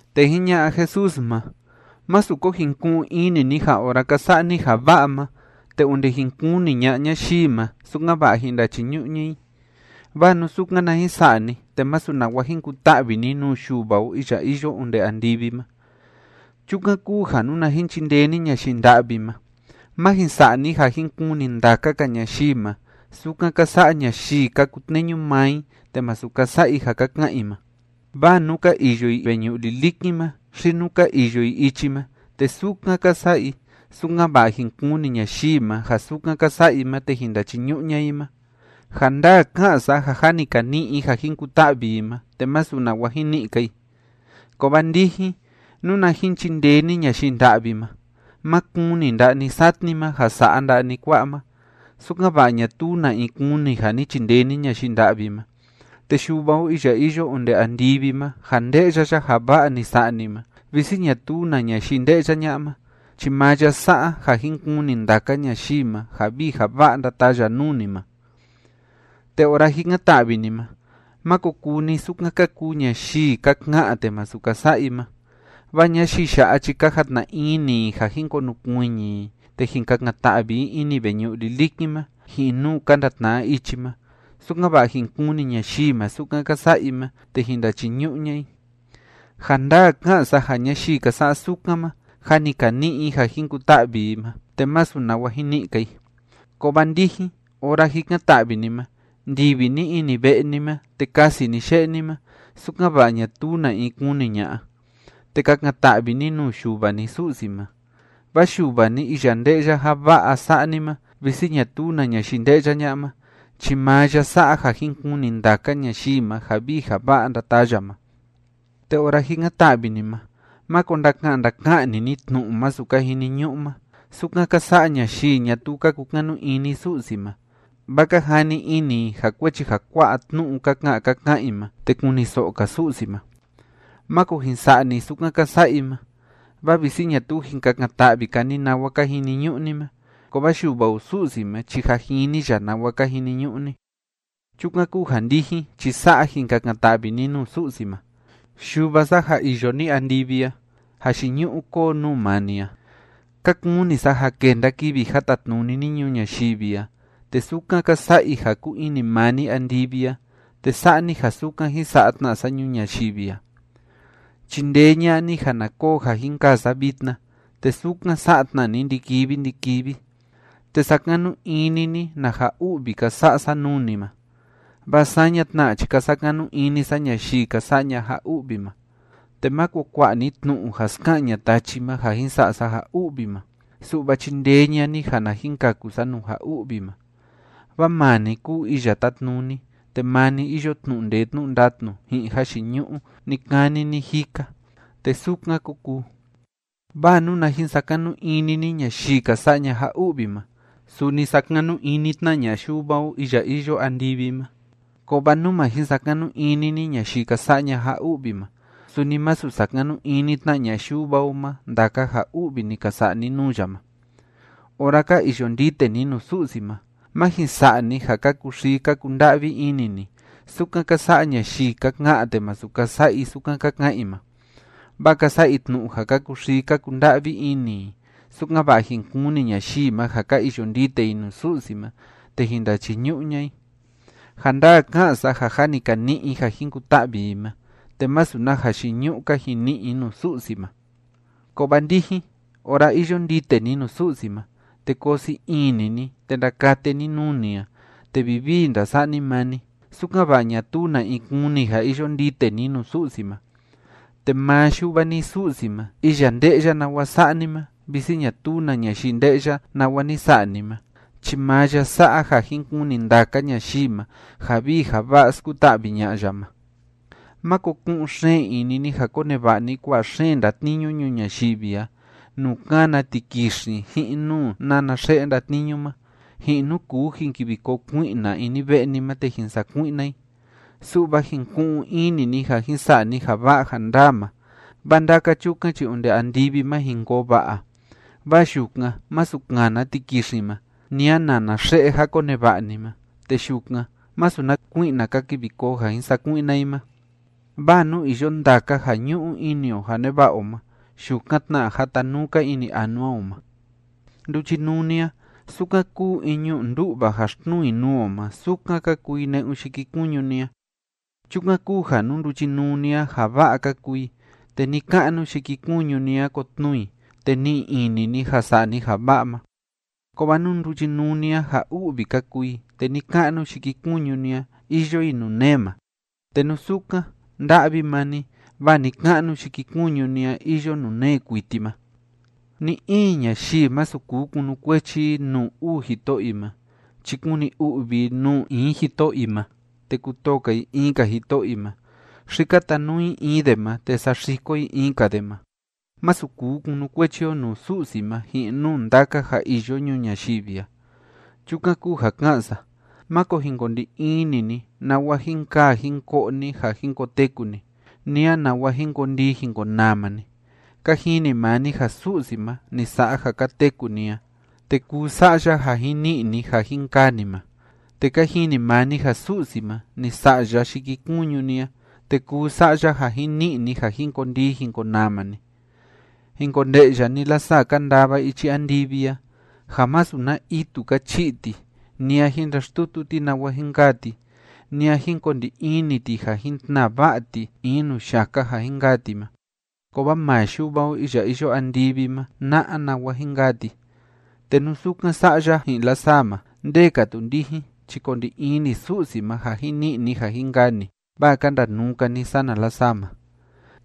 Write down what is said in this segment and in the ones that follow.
Te jiña'a Jesús ma: ―Másu ko jin ku'un ini ni ja ora ka sa'a ni ja va'a ma, te onde jin kuni ña'a ñayii ma, sukan‑va'a jin ndachiñu'u ña'a i. Vaa nú sukan na jin sa'a ni, te masu nawa jin kuta'vi ni nuu Yuva o iya iyo onde andivi ma. Chukan kúu ja nuna jin chindee ni ñayii nda'vi ma, má jin sa'a ni ja jin kuni ndaka‑ka ñayii ma, sukan ka sa'a ñayii ka kutneñu maa i te masu ka sa'a i ja ka ka'an i ma. Vaa nú ka iyo i veñu'u lilikin ma xi nú ka iyo i ichi ma, te sukan ka sa'a i, sukan‑va'a jin kuni ñayii ma ja sukan ka sa'a i ma te jin ndachiñu'u ña'a i ma. Ja ndaa ká'an sa ja jâ ni ka ni'i i ja jin kuta'vi i ma, te masu nawa jin ni'i‑ka i. Kovaa ndijin, nuna jin chindee ni ñayii nda'vi ma, má kuni nda'a ni satni ma ja sa'a nda'a ni kua'a ma, sukan‑va'a ñatuu na in kuni ja ni chindee ni ñayii nda'vi ma, te Yuva o iya iyo onde andivi ma ja nde'ya ya ja va'a ni sa'a ni ma visi ñatuu na ñayii nde'ya ña'a ma, chi maa ya sa'a ja jin kuni ndaka ñayii ma ja vii ja va'a ndataa ya nuu ni ma. ’Te ora jikan‑ta'vi ni ma, máko kuu ni sukan ka kuu ñayii ka ka'an te masu ka sa'a i ma, vaa ñayii ya'a chi ka jatna ini i ja jin konukuiñi i te jin kakan‑ta'vi i ini veñu'u lilikin ma ji'in nuu ka ndatna'a ichi ma, sukan‑va'a jin kuni ñayii ma sukan ka sa'a i ma te jin ndachiñu'u ña'a i. Ja ndaa ká'an sa ja ñayii ka sa'a sukan ma jâ ni ka ni'i i ja jin kuta'vi i ma, te masu nawa jin ni'i‑ka i. Kovaa ndijin, ora jikan‑ta'vi ni ma, ndivi ni ini ve'e ni ma, te kasi ni ye'e ni ma sukan‑va'a ñatuu na in kuni ña'a, te kakan‑ta'vi ni nuu Yuva ni Su'si ma. Vaa Yuva ni iya nde'ya ja va'a sa'a ni ma visi ñatuu na ñayii nde'ya ña'a ma, chi maa ya sa'a ja jin kuni ndaka ñayii ma ja vii ja va'a ndataa ya ma. ’Te ora jikan‑ta'vi ni ma, máko ndaka'an ndaka'an‑ni ni tnu'u masu ka jiniñu'u ma, sukan ka sa'a ñayii ñatuu ka kukanu ini Su'si ma, vaa ka jani ini i ja kuechi ja kua'a tnu'u ka ka'an ka ka'an i ma, te kuniso'o‑ka Su'si ma. Máko jin sa'a ni sukan ka sa'a i ma, vaa visi ñatuu jin kakan‑ta'vi‑ka ni nawa ka jiniñu'u ni ma, kovaa Yuva o Su'si ma chi jâ jini ya nawa ka jiniñu'u ni. Chukan kúu ja, ndijin chi sa'a jin kakan‑ta'vi ni nuu Su'si ma: Yuva sa ja iyo ni andivi a, jayiñu'u kóo nuu maa ni a. Ka kuni sa ja kenda kivi ja tatnuni ni ñuu ñayivi a, te sukan ka sa'a i ja kúu ini maa ni andivi a, te sa'a ni ja sukan jín sa'a tna sa ñuu ñayivi a. Chindee ña'a ni ja na koo ja jin kaa sa vitna, te sukan sa'a tna ni ndi‑kivi ndi‑kivi. Te sakanu ini ni na ja u'vi ka sa'a sa nuu ni ma, vaa saña tna chi ka sakanu ini sa ñayii ka sa'a ña'a ja u'vi ma. Te máko kua'a ni tnu'u ja ska'an ña'a tachi ma ja jin sa'a sa ja u'vi ma, su'va chindee ña'a ni ja na jin kaku sa nuu ja u'vi ma. Vaa maa ni kúu iya tátnuni, te maa ni iyo tnu'u ndee tnu'u ndatnu ji'in jayiñu'u ni‑kani ni‑jika. Te sukan kó kuu. ’Vaa nuna jin sakanu ini ni ñayii ka sa'a ña'a ja u'vi ma, suni sakanu ini tna ña'a Yuva o iya iyo andivi ma. Kovaa nú ma jin sakanu ini ni ñayii ka sa'a ña'a ja u'vi ma, suni masu sakanu ini tna ña'a Yuva o ma ndaka ja u'vi ni ka sa'a ni nuu ya ma. ’Ora ka iyo ndite ni nuu Su'si ma, má jin sa'a ni ja ka kuxii, ka kunda'vi ini ni, sukan ka sa'a ñayii ka ka'an te masu ka sa'a i sukan ka ka'an i ma, vaa ka sa'a i tnu'u ja ka kuxii, ka kunda'vi ini i, sukan‑va'a jin kuni ñayii ma ja ka iyo ndite i nuu Su'si ma te jin ndachiñu'u ña'a i. Ja ndaa ká'an sa ja jâ ni ka ni'i i ja jin kuta'vi i ma, te masu na jayiñu'u‑ka jin ni'i i nuu Su'si ma. Kovaa ndijin, ora iyo ndite ni nuu Su'si ma, te koo sii ini ni, te ndakate ni nuu ni a, te vivii ndasa'a ni maa ni, sukan‑va'a ñatuu na in kuni ja iyo ndite ni nuu Su'si ma, te maa Yuva ni Su'si ma, iya nde'ya nawa sa'a ni ma visi ñatuu na ñayii nde'ya nawa ni sa'a ni ma chi maa ya sa'a ja jin kuni ndaka ñayii ma ja vii ja va'a skuta'vi ña'a ya ma. ’Máko ku'un xeen ini ni ja koneva'a ni kua'a xeen ndatniñu ñuu ñayivi a nuu kána tikixin, ji'in nuu nána xe'e ndatniñu ma, ji'in nuu kuu jin kivi koo kui'na ini ve'e ni ma te jin sakui'na i. Su'va jin ku'un ini ni ja jin sa'a ni ja va'a ja ndaa ma, vaa ndaka chukan chi onde andivi ma jin koo va'a. Vaa yukan masu kana tikixin ma, ni a nana xe'e ja koneva'a ni ma, te yukan masu na kui'na ka kivi koo ja jin sakui'na i ma. Vaa nuu iyo ndaka ja ñu'u ini o ja neva'a o ma, yukan tna jatanuu‑ka ini anua o ma. ’Nduchinuu ni a, sukan kúu in ñu'u ndú'va ja xtnuu i nuu o ma, sukan ka kuu i ne'un yikikuñu ni a. Chukan kúu ja nú nduchinuu ni a, ja va'a ka kuu i, te ni‑ka'nu yikikuñu ni a, kotnuu i, te ni'i ini ni ja sa'a ni ja va'a ma. Kovaa nú nduchinuu ni a, ja u'vi ka kuu i, te ni‑ka'nu yikikuñu ni a, iyo i nuu nee ma. Te nú sukan, nda'vi maa ni vaa ni‑ka'nu yikikuñu ni a iyo nuu nee kuiti ma. ’Ni‑in ñayii, masu kuu kunukuechi i nuu uu jito'o i ma chi kuni u'vi i nuu in jito'o i ma te kutoo‑ka i in‑ka jito'o i ma, xi katanuu i in de ma te saxiko i in‑ka de ma. Masu kuu kunukuechi o nuu Su'si ma ji'in nuu ndaka ja iyo ñuu ñayivi a. ’Chukan kúu ja ká'an sa: Máko jin ko ndi ini ni nawa jin kaa jin ko'o ni ja jin koteku ni, ni a nawa jin kondii jin konama ni. Ka jini maa ni ja Su'si ma ni sa'a ja ka teku ni a, te kuu sa'a ya ja jin ni'i ni ja jin kaa ni ma. Te ka jini maa ni ja Su'si ma, ni sa'a ya yikikuñu ni a, te kuu sa'a ya ja jin ni'i ni ja jin kondii jin konama ni. Jin konde'ya ni lasaa ka ndava ichi andivi a, ja masu na itu ka chi'i ti, ni a jin ndaxtutu ti nawa jin kaa ti, ni a jin ko ndi ini ti ja jin tnaa va'a ti in nuu yaka ja jin kaa ti ma. Kovaa maa Yuva o iya iyo andivi ma na'a nawa jin kaa ti. ¡Te nú sukan sa'a ya ji'in lasaa ma, nde‑ka tu ndijin chi ko ndi ini Su'si ma ja jin ni'i ni ja jin kaa ni, vaa ka ndanuu‑ka ni sana lasaa ma!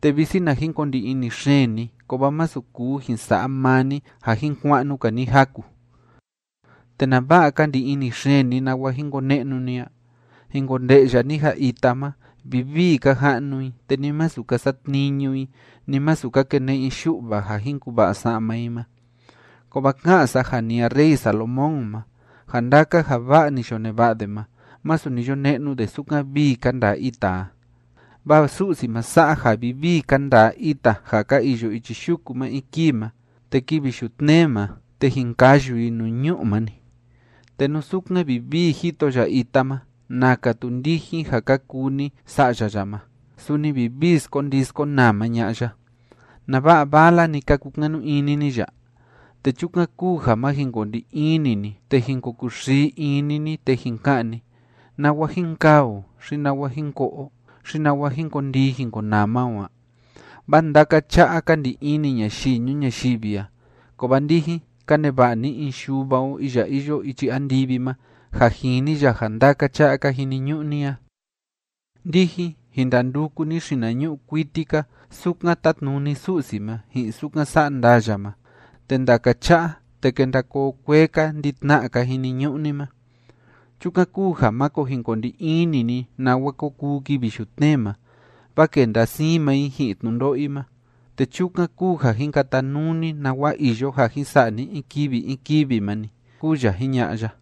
Te visi na jin ko ndi ini xeen ni, kovaa masu kuu jin sa'a maa ni ja jin kua'nu‑ka ni jaku. ’¿Te nava'a ka ndi ini xeen ni nawa jin kone'nu ni a? Jin konde'ya ni ja ita ma, vivii ka ja'nu i. Te ni masu ka satniñu i, ni masu ka kene'e i yu'va ja jin kuva'a sa'ma i ma. Kovaa ká'an sa ja ni a rey Salomón ma, ja ndaka ja va'a ni yo neva'a de ma, masu ni yo ne'nu de sukan vii ka ndaa ita a. Vaa Su'si ma sa'a ja vivii ka ndaa ita ja ka iyo ichi yuku ma in kii ma, te kivi yutnee ma, te jin kayu i nuu ñu'u ma‑ni. ¡Te nú sukan vivii jito ya ita ma, naka tu ndijin ja ka kuu ni sa'ya ya ma, suni vivii skondii skonama ña'a ya! ¿Nava'a vala‑ni ka kukanu ini ni ya? Te chukan kúu ja má jin ko ndi ini ni te jin ko kuxii ini ni te jin ka'an ni: “¿Nawa jin kaa o? xi ¿nawa jin ko'o o? xi ¿nawa jin kondii jin konama o a?” Vaa ndaka cha'a ka ndi ini ñayii ñuu ñayivi a, kovaa ndijin, ka neva'a ni in Yuva o iya iyo ichi andivi ma ja jini ya ja ndaka cha'a ka jiniñu'u ni a. Ndijin, jin ndanduku ni xinañu'u kuiti‑ka sukan tátnuni Su'si ma, ji'in sukan sa'a ndaa ya ma, te ndaka cha'a, te kenda koo kuee‑ka ndi‑tna'a ka jiniñu'u ni ma. Chukan kúu ja máko jin ko ndi ini ni nawa ko kuu kivi yutnee ma, vaa kenda siin maa i ji'in tnundo'o i ma, te chukan kúu ja jin katanuu ni nawa iyo ja jin sa'a ni in kivi in kivi ma‑ni ―kúu ya jiña'a ya.